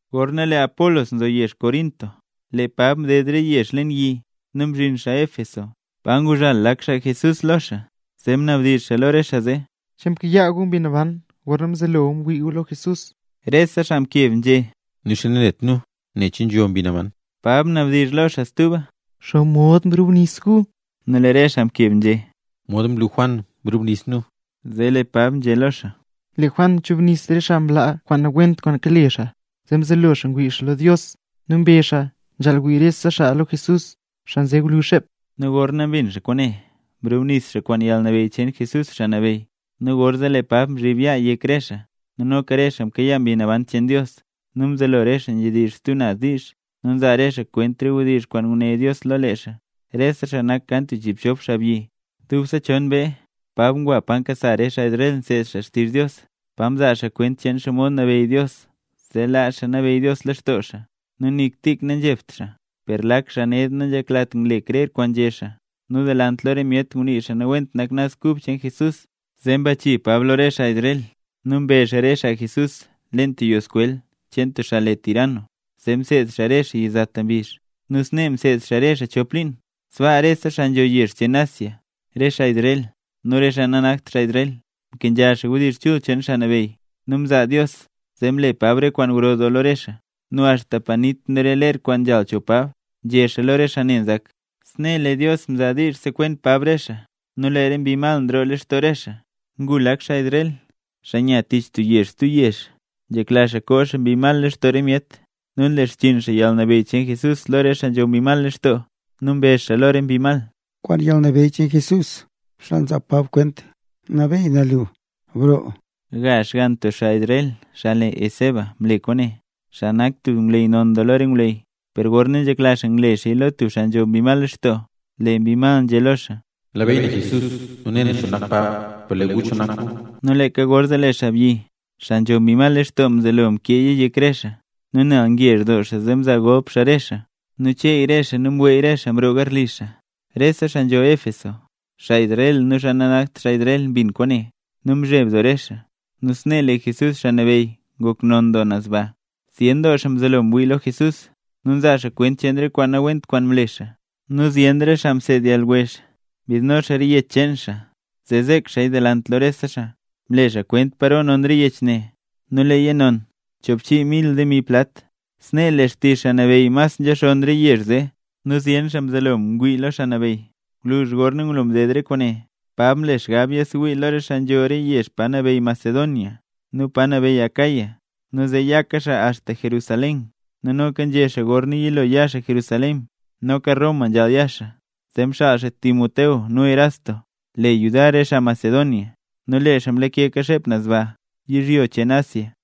Gorna lee Apolos nzo yezh Corinto, lee Pab mded re yezh leen yi nu mzhin xaa Éfeso, pa nguzhal lak xaa Jesús lo xaa. Zee mnabdizh xaa lo re xaa zee: —¿Che mkayaa gu Mbi Naban gorna mzelo gu ngwii gu lo Jesús? Rese xaa mkeb nzhé: —Nixa nanet nu nen che nzho Mbi Naban. Pab mnadizh lo xaa stuba: —¿Xomod mrubnis gu? Nu lee re xaa mkeb nzhé: —Mod mlu Juan, mrubnis nu. Zee lee Pab nzhé lo xaa: —Lee Juan mchubnis re xaa mlaa kwaan nawent kwaan kale xaa nu mzelo xaa ngwii lo Dios. Nu mbezh xaa nzhaal wii rese xaa lo Jesús, xaa nze gwluzh xep. Nu gorna mbin xaa kwaane mrubnis xaa kwaan yalnabeyy cheen Jesús, Xaa Nabeyy. Nu gorzee lee Pab mzhib yaa xaa yek re xaa, nu noka re xaa mkayaa Mbi Naban cheen Dios, nu mzelo re xaa nzhedizh xaa stub naz diizh, nu nzaa re xaa kwent re wdizh kwaan nguné Dios lo lee xaa. Rese xaa nak kan tub chiibchop xaabyi. Dubse chon mbee, Pab ngwa pa nkasa re xaa Israel nseed xaa xtizh Dios, pa mzaa xaa kwent cheen xomod nabeyy Dios zee laa xaa nabeyy Dios lextoo xaa, nu nik tik nanzhebt xaa. Per lak xaa ned nanzheklat ngle xaa krer kwaan nzhé xaa, nu delant lo re myet ngunii nawent xaa Naz Kub cheen Jesús. Zee mbachii Pab lo re xaa Israel nu mbe xaa re xaa Jesús leen tub yoo skwel cheen tub xaa le Tiranno, zee mseed xaa re xaa yizata mbizh. Nu snee mseed xaa re xaa chop liin. Sbaa rese xaa nzho rese yezh cheen Asia, re xaa Israel, nu re xaa nanakt xaa Israel, mkenzha xaa wdizh chul cheen Xaa Nabeyy. Nu mzaa Dios zee mle Pab re kwaan gro doo lo re xaa. Nu axta panit nu re ler kwaan nzhal cho Pab, nzhe xaa lo re xaa ne nzak, snee lee Dios mzaa diizh sekwen Pab re xaa, nu lee re mbi mal nroo lextoo re xaa. Ngu lak xaa Israel, xaa nya tich tub yezh stub yezh, nzhekla xaa koo xaa mbi mal lextoo re myet. Nu nle xchiin xaa yalnabeyy cheen Jesús lo re xaa nzho mbi mal lextoo nu mbezh xaa lo re mbi mal: —Kwaan yalnabeyy cheen Jesús, xaa nzaa Pab kwent, nabeey na lu, broo. Gazh xgann tub xaa Israel xaa le Esceva mle kwaane, xaa nak tub ngwleyy non lo re ngwleyy. Per gorna nzhekla xaa ngle xaaya lo tub xaa nzho mbi mal lextoo, lee mbi mal nzhé lo xaa: —Nlabeyy na Jesús, nu ne na cho nak Pab, ¿per lee gu cho nak gu? Nu leeka gorzee lee xaabyi, xaa nzho mbi mal lextoo mzelo mkee yek re xaa, nu nel ngezh doo xaa zee mzaa golp xaa re xaa, nu cheey re xaa nu mweey re xaa mroo garli xaa. Rese xaa nzho Éfeso, rop xaa Israel nu re xaa nanakt xaa Israel, mbin xaa kwaane, nu mzheb doo re xaa. Nu snee lee Jesús, Xaa Nabeyy ngok non doo naz baa. Zyen doo xaa mzelo ngwii lo Jesús, nu nzaa xaa kwent cheen re kwaan nawent kwaan mle xaa. Nu zyen xaa mseed yalwezh mbidno re yech cheen xaa zee zek xaaya delant lo rese xaa. Mle xaa kwent paro non re yech ne, nu nona choobchii mil demi plat. Snee lee xtizh Xaa Nabeyy mas nzhaxonn re yezh zee, nu zyen xaa mzelo ngwii lo Xaa Nabeyy. Gwluzh gorna ngulo mded re kwaane, Pab mle xgab yasewii lo re xaa nzho re yezh pa nabeyy Macedonia nu pa nabeyy Acaya, nu zee yaka xaa axta Jerusalén; nu noka nzhé xaa gorna yilo ya xaa Jerusalén, noka Roma nzhaal ya xaa. Zee mxaal xaa Timoteo nu wech Erasto le yudar re xaa Macedonia. Nu lee xaa mlakeka xep naz baa, yizhyo cheen Asia.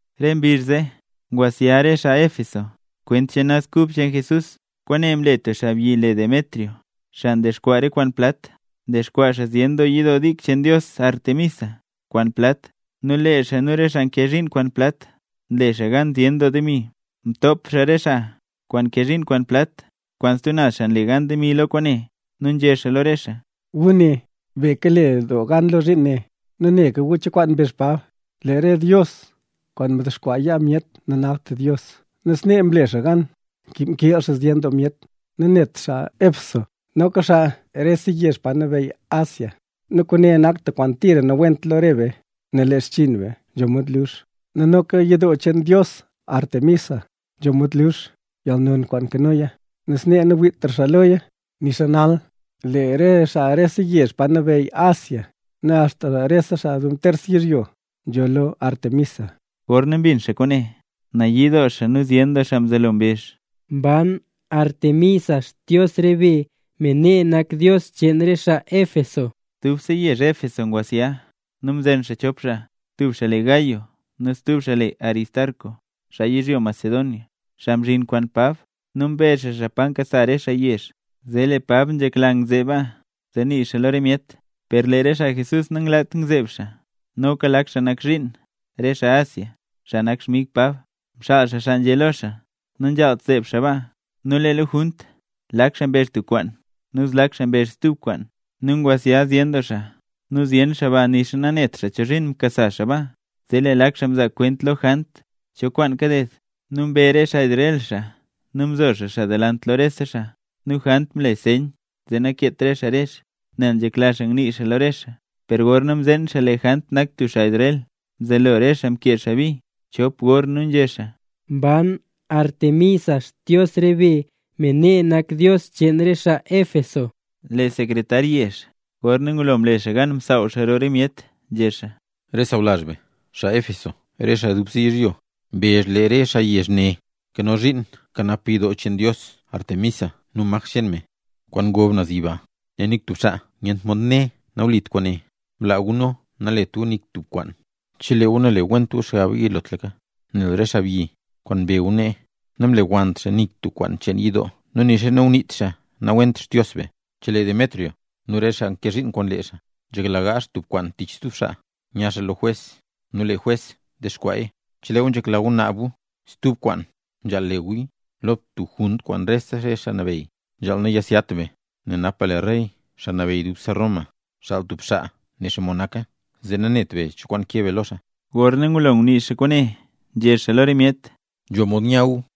Re mbizh zee ngwasya re xaa Éfeso kwent cheen Naz Kub cheen Jesús. Kwaane mle tub xaabyi le Demetrio, xaa ndexkwaa re kwaan plat, ndexkwaa xaa zyen yidoo dik cheen dios Artemisa kwaan plat, nu lee xaa nu re xaa nkee zhiin kwaan plat, nle xaa gan zyen doo demi. Mtop xaa re xaa kwaan nkee zhiin kwaan plat kwaan stub naz xaa nle gan demi lo kwaane, nu nzhé xaa lo re xaa: —Gu ne, be kale doo gan lo zhiin ne. Nu neka gu cho kwaan mbezh Pab: “Lee re dios kwaan ndexkwaa yaa myet nanakt dios”. Nu snee mle xaa gan mkiil xaa zyen doo myet, nu nanebt xaa Éfeso noka xaa rese yezh pa nabeyy Asia. Nu kwaane nak tub kwaan tira nawent lo re be, nel lee xchiin be nzho mod lux. Nu noka yidoo cheen dios Artemisa nzho mod lux yalnon kwaan nkanoya, nu snee nawiitra xaa loya, nixa nal lee re xaa rese yezh pa nabeyy Asia nu axta rese xaa dub ntersa yizhyo nzholl lo Aretmisa. Gorna mbin xaa kwaane, nayii doo xaa nu zyen doo xaa mzelo mbezh: —¡Mban Artemisa, xdios re be, me nak dios cheen re xaa Éfeso! Dubse yezh Éfeso ngwasya nu mzen xaa chop xaa, tub xaa le Gayo nu stub xaa le Aristarco, xaa yizhyo Macedonia, xaa mzhin kwaan Pab. Nu mbe xaa xaa pa nkasa re xaa yezh. Zee lee Pab nzhekla ngzeeb baa, zee nii xaa lo re myet, per lee re xaa Jesús nanglat ngzeeb xaa. Noka lak xaa nak zhiin, re xaa Asia, xaa nak xmig Pab, mxaal xaa xaa nzhé lo xaa, nanzhaalt zeeb xaa baa. Nu lee lo junt, lak xaa mbezh tub kwaan, nu zlak xaa mbezh stub kwaan, nu ngwasya zyen doo xaa nu zyen xaa ba nixa nanet xaa chozhiin mkasa xaa baa. Zee lee lak xaa mzaa kwent lo Jant cho kwaan kaded, nu mbe re xaa Israel xaa nu mzo xaa xaa delant lo rese xaa. Nu Jant mle nseyn zee nakeet re xaa rezh, nel nzhekla xaa ngnii xaa lo re xaa. Per gorna mzeen xaa lee Jant nak tub xaa Israel, mzelo re xaa mkee xaa bi chop gor nu nzhé xaa: —¡Mban Artemisa, xdios re be, me nak dios cheen re xaa Éfeso! Lee sekretar yezh, gorna ngulo mle xaa gan msaaw xaa roo re myet, nzhé xaa: —Re xaa sawlazh be, xaa Éfeso, re xaa dubse yizhyo mbezh lee re xaa yezh ne nkano zhiin nkanap yidoo cheen dios Artemisa nu maj cheen me, kwaan ngob naz yiba. Nel nik tub xaa nyent mod né nawlit kwaane, blaa gu nu nalet gu nik tub kwaan, chelee gu nale went gu xgaba yilotlaka. Nel re xaabyi kwaan mbe gu nee, namlewannt xaa nik tub kwaan cheen yidoo nu nixa nanguniit xaa nawent Xdios be. Chelee Demetrio nu re xaa nkee zhiin kwaan lee xaa nzhekla gaazh tub kwaan tich tub xaa, nya xaa lo jwes nu lee jwes dexkwaaya. Chelee gu nzhekla gu naab gu stub kwaan nzhaal le guya lo tub junt kwaan rese xaa nabeyy. Nzhaal nayasyat be nel napa lee rey, xaa nabeyy dubse Roma, xaal tub xaa ne xomod naka, zee nanet be cho kwaan keb be lo xaa. Gorna ngulo ngunii xaa kwaane, nzhé xaa lo re myet: —Nzho mod nya gu.